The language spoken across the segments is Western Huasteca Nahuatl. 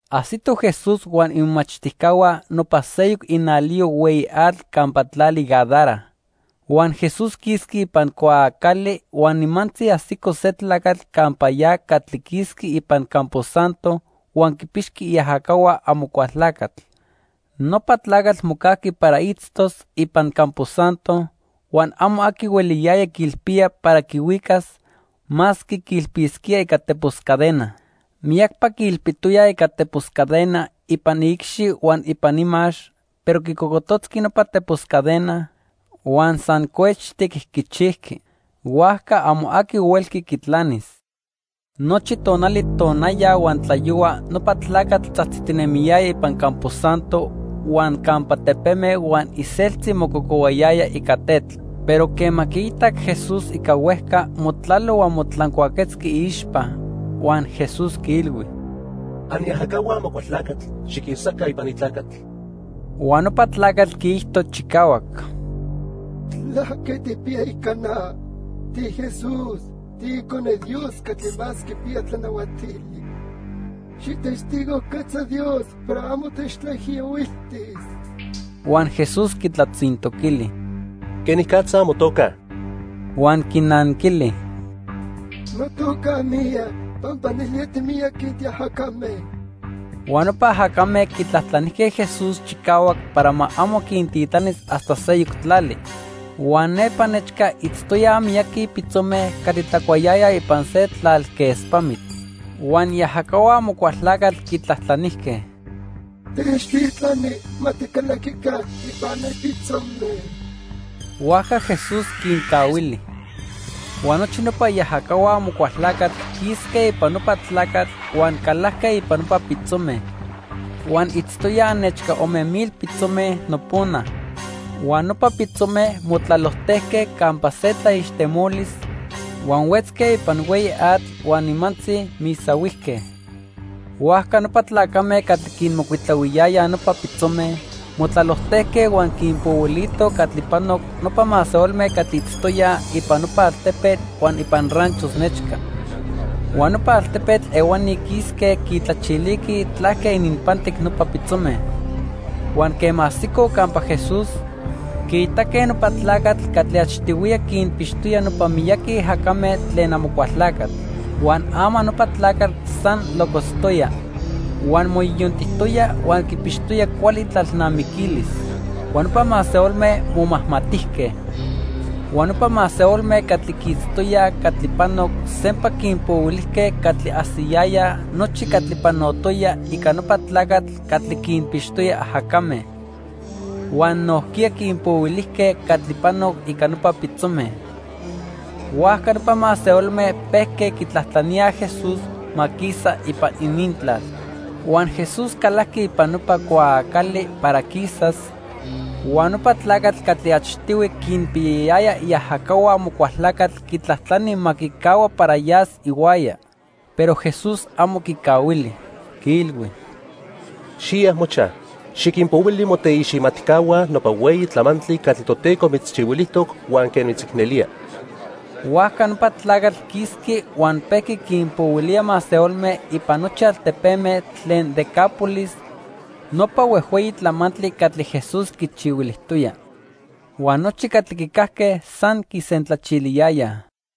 Ajsitoj Jesús huan imomachtijcahua nopa seyoc inaliyo hueyi atl campa tlali Gadara. Huan Jesús quisqui ipan cuaacali huan nimantzi ajsico se tlacatl campa ya catli quisqui ipan campo santo huan quipixqui iajacahua Amocualtlacatl. Nopa tlacatl mocajqui para itztos ipan campo santo, huan amo aqui hueliyaya quiilpía para quihuicas, masque quiilpisquía ica tepos cadena. Miyacpa quiilpijtoyaj ica tepos cadena ipan iicxi huan ipan imax, pero quicocototzqui nopa tepos cadena, huan san cuechtic quichijqui. Huajca amo aqui huelqui quitlanis. Nochi tonali tonaya huan tlayohua nopa tlacatl tzajtzitinemiyaya ipan campo santo huan campa tepeme huan iseltzi mococohuayaya ica tetl. Pero quema quiitac Jesús ica huejca, motlalo huan motlancuaquetzqui iixpa. Huan Jesús quiilhui: —Aniajacahua Amocualtlacatl, xiquisaca ipan ni tlacatl. Huan nopa tlacatl quiijto chicahuac: —¿Tlaque tijpiya ica na? TiJesús, tiIcone Dios Catli Más Quipiya Tlanahuatili. Xijtestigojquetza Dios para amo techtlaijiyohuiltis. Huan Jesús quitlatzintoquili: —¿Quenicatza motoca? Huan quinanquili: —Notoca, Miyac, pampa nelía timiyaqui tiajacame. Huan nopa ajacame quitlajtlanijque Jesús chicahuac para ma amo quintitlanis hasta seyoc tlali. Huan nepa nechca itztoyaj miyaqui pitzome catli tlacuayayaj ipan se tlalquespamitl. Huan iajacahua Amocualtlacatl quitlajtlanijque: —Techtitlani ma ticalaquica ipan ne pitzome. Huajca Jesús quincahuili. Huan nochi nopa iajacahua Amocualtlacatl quisque ipan nopa tlacatl huan calajque ipan nopa pitzome. Huan itztoyaj nechca ome mil pitzome nopona. Huan nopa pitzome motlalojtejque campa se tlaixtemolis, huan huetzque ipan hueyi atl huan nimantzi misahuijque. Huajca nopa tlacame catli quinmocuitlahuiyayaj nopa pitzome motlalojtejque huan quinpohuilitoj catli panoc nopa masehualme catli itztoyaj ipan nopa altepetl huan ipan ranchos nechca. Huan nopa altepetl ehuani quisque quitlachiliquij tlaque ininpantic nopa pitzome. Huan quema ajsicoj campa Jesús, quiitaque nopa tlacatl catli achtihuiya quinpixtoya nopa miyaqui ajacame tlen Amocualtlacatl. Huan ama nopa tlacatl san locotztoya, huan moyoyontijtoya huan quipixtoya cuali itlalnamiquilis. Huan nopa masehualme momajmatijque. Huan nopa masehualme catli quiitztoyaj catli panoc sempa quinpohuilijque catli ajsiyayaj nochi catli panotoya ica nopa tlacatl catli quinpixtoya ajacame. Huan nojquiya quinpohuilijque catli panoc ica nopa pitzome. Huajca nopa masehualme pejque quitlajtlaníaj Jesús ma quisa ipan inintlal. Huan Jesús calajqui ipan nopa cuaacali para quisas, huan nopa tlacatl catli achtihui quinpiyayaya iajacahua Amocualtlacatl quitlajtlani ma quicahua para yas ihuaya. Pero Jesús amo quicahuili. Quiilhui: —Xiya mochaj, xiquinpohuili moteiximatcahua nopa hueyi tlamantli catli Toteco mitzchihuilijtoc huan quen mitzicnelía. Huajca nopa tlacatl quisqui huan pejqui quinpohuilía masehualme ipan nochi altepeme tlen Decápolis nopa huejhueyi tlamantli catli Jesús quichihuilijtoya. Huan nochi catli quicajque san quisentlachiliyayaj.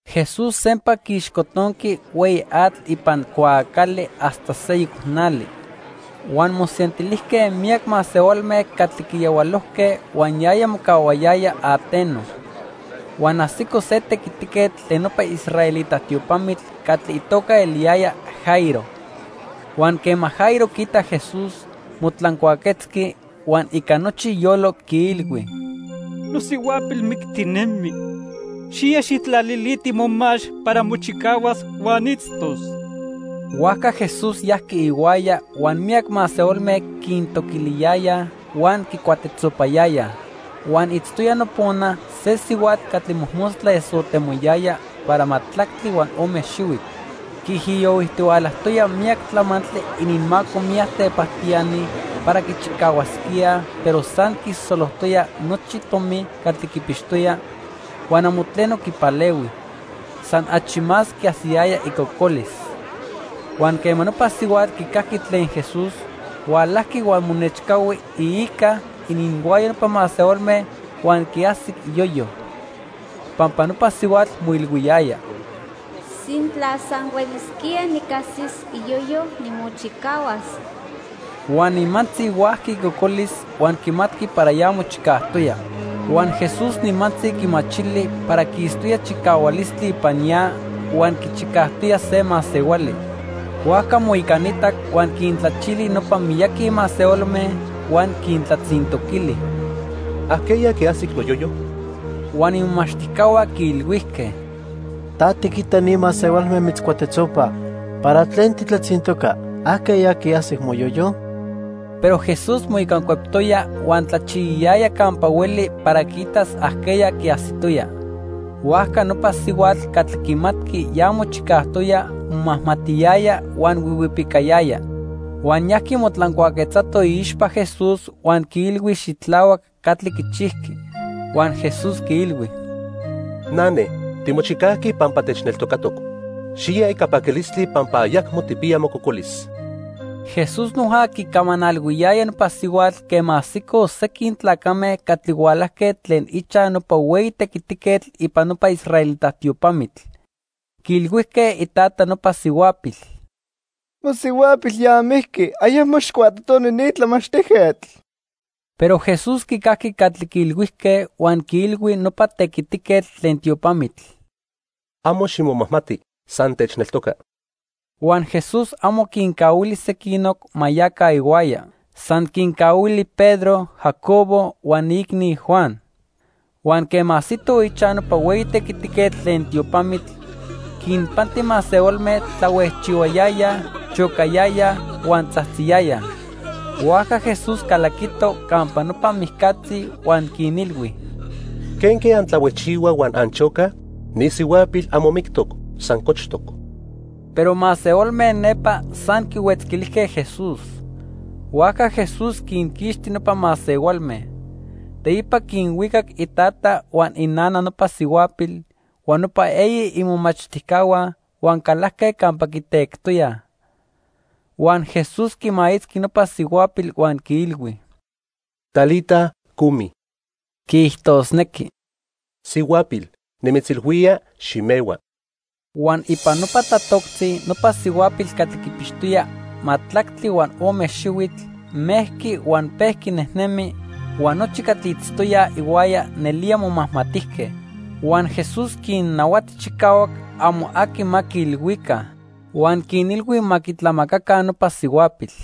Jesús sempa quiixcotonqui hueyi atl ipan cuaacali hasta seyoc nali. Huan mosentilijque miyac masehualme catli quiyahualojque huan yaya mocahuayaya ateno. Huan ajsico se tequitiquetl tlen nopa israelita tiopamitl catli itoca eliyaya Jairo. Huan quema Jairo quiitac Jesús, motlancuaquetzqui, huan ica nochi iyolo, quiilhui: —Nosihuapil mictinemi. Xiya, xijtlaliliti momax para mochicahuas huan itztos. Huajca Jesús yajqui ihuaya, huan miyac masehualme quintoquiliyayaj huan quicuatetzopayayaj. Huan itztoya nopona se sihuatl catli mojmostla esotemoyaya para majtlactli huan ome xihuitl. Quiijiyohuijtihualajtoya miyac tlamantli ininmaco miyac tepajtiani para quichicahuasquíaj pero san quisosolojtoya nochi tomi catli quipixtoya, huan amo tleno quipalehui. San achi más quiajsiyaya icocolis. Huan quema nopa sihuatl quicajqui tlen Jesús, hualajqui huan monechcahui iica ininhuaya nopa masehualme huan quiajsic iyoyo. Pampa nopa sihuatl moilhuiyaya: "Sintla san huelisquía nicajsis iyoyo, nimochicahuas." Huan nimantzi huajqui icocolis huan quimatqui para ya mochicajtoya. Huan Jesús nimantzi quimachili para quistoya chicahualistli ipan ya huan quichicajtoya se masehuali. Huajca moicanitac huan quintlachili nopa miyaqui masehualme huan quintlatzintoquili: —¿Ajqueya quiajsic noyoyo? Huan imomachtijcahua quiilhuijque: —Ta tiquita ni masehualme mitzcuatetzopaj, ¿para tlen titlatzintoca, ajqueya quiajsic moyoyo? Pero Jesús moicancueptoya huan tlachiyayaya campa hueli para quiitas ajqueya quiajsitoya. Huajca nopa sihuatl catli quimatqui ya mochicajtoya momajmatiyaya huan huihuipicayaya. Huan yajqui motlancuaquetzato iixpa Jesús huan quiilhui xitlahuac catli quichijqui. Huan Jesús quiilhui: —Nane, timochicajqui pampa techneltocatoc. Xiya ica paquilistli pampa ayacmo tijpiya mococolis. Jesús noja quicamanalhuiyaya nopa sihuatl quema ajsicoj sequin tlacame catli hualajque tlen ichaj nopa hueyi tequitiquetl ipan nopa israelita tiopamitl. Quiilhuijque itata nopa sihuapil: —Mosihuapil ya mijqui. Ayacmo xijcuatotoni ni tlamachtijquetl. Pero Jesús quicajqui catli quiilhuijque huan quiilhui nopa tequitiquetl tlen tiopamitl: —Amo ximomajmati, san techneltoca. Huan Jesús amo quincahuili sequinoc ma yaca ihuaya. San quincahuili Pedro, Jacobo huan iicni, Juan. Huan quema ajsitoj ichaj nopa hueyi tequitiquetl tlen tiopamitl, quinpanti masehualme tlahuejchihuayayaj, chocayayaj huan tzajtziyayaj. Huajca Jesús calaquito campa nopa mijcatzi huan quinilhui: —¿Quenque antlahuejchihuaj huan anchocaj? Ni sihuapil amo mictoc, san cochtoc. Pero masehualme nepa san quihuetzquilijque Jesús. Huajca Jesús quinquixti nopa masehualme. Teipa quinhuicac itata huan inana nopa sihuapil, huan nopa eyi imomachtijcahua huan calajque campa quitectoyaj. Huan Jesús quimaitzqui nopa sihuapil huan quiilhui: —Talita, cumi (quiijtosnequi: 'Sihuapil, nimitzilhuía: ximehua.') Huan ipan nopa tlatoctzi nopa sihuapil catli quipixtoya majtlactli huan ome xihuitl, mejqui huan pejqui nejnemi, huan nochi catli itztoyaj ihuaya nelía momajmatijque. Huan Jesús quinnahuati chicahuac amo aqui ma quiilhuica. Huan quinilhui ma quitlamacaca nopa sihuapil.